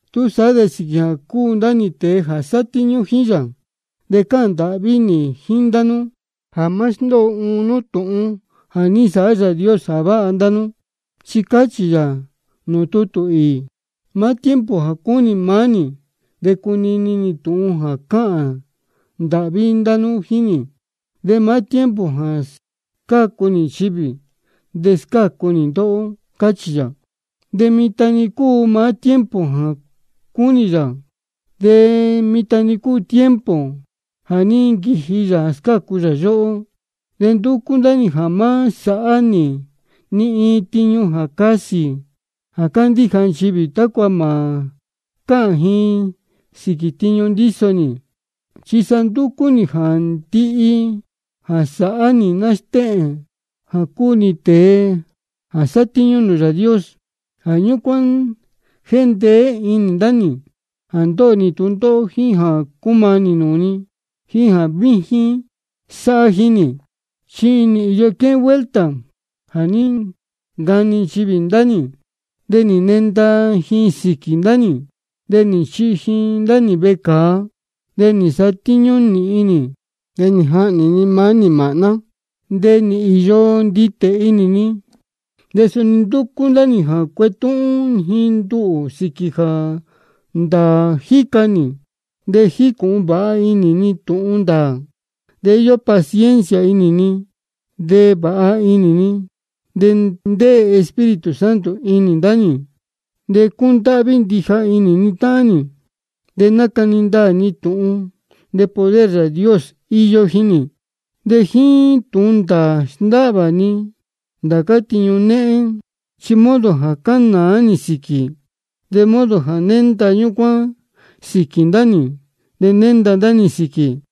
Túsaá de sīquī jā cúu ndá nī tēe jā sátíñú jíín yā, de cáhān ndāhví nī jíín ndá nú jā má sndóo uun nú tūhun jā ní nsāhá Yāā Dios jā váha ndá nú. Chi cáchī yā nūū tutū īī: Maá tiempo jā cúnī maá nī de cunini nī tūhun jā cáhān ndāhví nú jíín nī. De maá tiempo jā scácu nī nchivī, de scácu nī ndóhó. Cáchī yā. De mitan-ni cúu maá tiempo jā cúnī yā, de mitan-ni cúu tiempo jā ní nquiji Yāā jā scácu yóhó. De ndúcú ndá nī jā má sāhá nī ni iin tiñu jā casī jā candíja nchivī, tácua mā cáhān ji sīquī tiñu ndíso nī. Chi sa ndúcú nī jā ndihi jā sáhá nī stéhēn jā cúu nī tēe jā sátíñú nūū Yāā Dios. Jā ñúcuán jéndeé inī ndá nī jā ndóho nī tūndóhó, jíín jā cúmanī nūū ni, jíín jā víjín sáhá jíín nī. Chi nī īyo quéhén vuelta jā ní ncani nchivī ndá nī, de nī nenda ji sīquī ndá nī, de nī nchihi ji ndá nī vecāa, de nī nsatíñú nīhin nī, de nī jahnī ni maá nī māhná, de nī īyo nditē inī ni. De suni ndúcú ndá nī jā cuetúhún ji nduhū sīquī jā ndāā jíca nī, de jícūhun vāha inī ni tūhun ndāā, de íyó paciencia inī ni, de vāha inī ni, de ndéē Espíritu Santo inī ndá nī, de cúndáhví ndija inī ni táhán nī. De nácani ndaā ndá nī tūhun, de poder Yāā Dios íyó jíín nī. De jíín tūhun ndāā sndáhvā ni ndācá tiñu néhén, chi modo jā cánāá nī sīquī. De modo jā nénda ñúcuán sīquī ndá nī, de nénda ndá nī sīquī.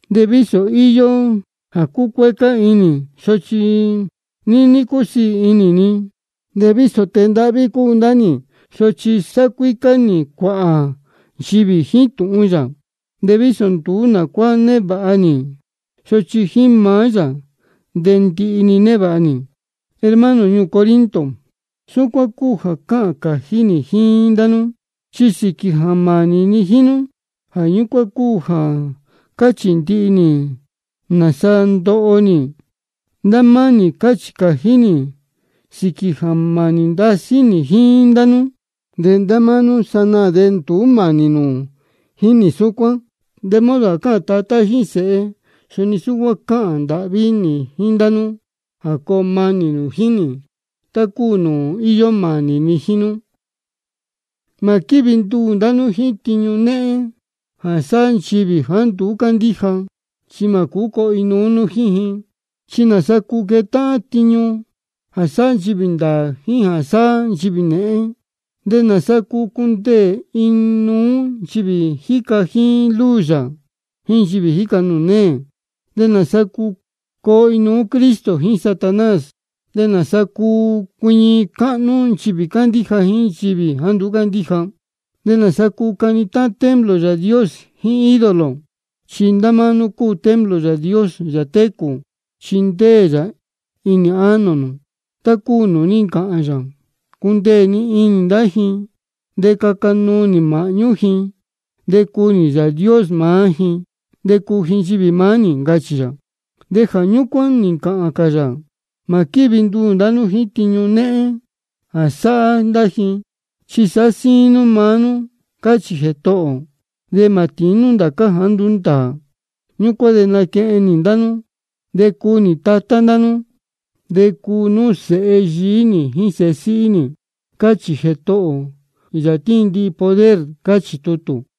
De vísō íyó jā cúcuécá inī ni, sochi níní cúsiī inī ni. De vísō tēe ndáhví cúu ndá nī, sochi sáhá cuícá nī cuāhā nchivī jíín tūhun yā. De vísō nduú nā cuá névāha nī, sochi jíín maá yā de ndihi-ni névāha nī. Hermano ñuū Corinto, súcuán cúu jā cáhān cājí nī jíín ndá nú, chi sīquī jā mānī ni jíín nú, jā ñúcuán cúu jā cáchī ndihi nī nāsa ndóho nī. Ndá máá nī cáchī cājí nī sīquī jā mānī ndasí nī jíín ndá nú, de ndá máá nú sanaā de nduú mānī nū jíín nī súcuán. De modo jā cáhān tatá jíín sēhe, suni súcuán cáhān ndāhví nī jíín ndá nú jā coo manī nū jíín nī, tá cúu nūū íyó mānī ni jíín nú. Mā quívi nduū ndá nú jíín tiñu néhén jā sáhá nchivī jāá nduú cándíja, chi mā cūú coo inuú nú jíín ji. ¿Chi nāsa cúu quetáhán tiñu jā sáhá nchivī ndāā jíín jā sáhá nchivī nēhén? ¿De nāsa cuu cundeē inuú nchivī jíca jíín luz yā jíín nchivī jíca nūū neē? ¿Nāsa cuu coo inuú Cristo jíín Satanás? ¿De nāsa cuu cuiñi cáhnú nchivī cándíja jíín nchivī jāá nduú cándíja? ¿De nāsa cuu cani táhán templo Yāā Dios jíín ídolo? Chi ndá máá nú cúu templo Yāā Dios, Yāā técū, chi ndéē yā inī ánō nū, tá cúu nūū ní ncāhān yā: Cundeē ni inī ndá ji de caca nuu nī māhñú ji, de cuu nī Yāā Dios maá ji, de cuu ji nchivī maá nī. Ncachī yā. De jā ñúcuán nī ncāhān cā yā: Mā quívi nduū ndá nú jíín tiñu néhén jā sáhá ndá ji, chi sāhá síín nú maá nú, cáchī Jētohō ō. De mā tīín nú ndācá jāá nduú ndāā. Ñúcuán de naquehen nī ndá nú, de cuu nī Tatá ndá nú, de cuu nú sēhe yií nī jíín sēhe síhí nī, cáchī Jētohō ō, Yāā jā tíin ndihi poder. Cáchī tutū.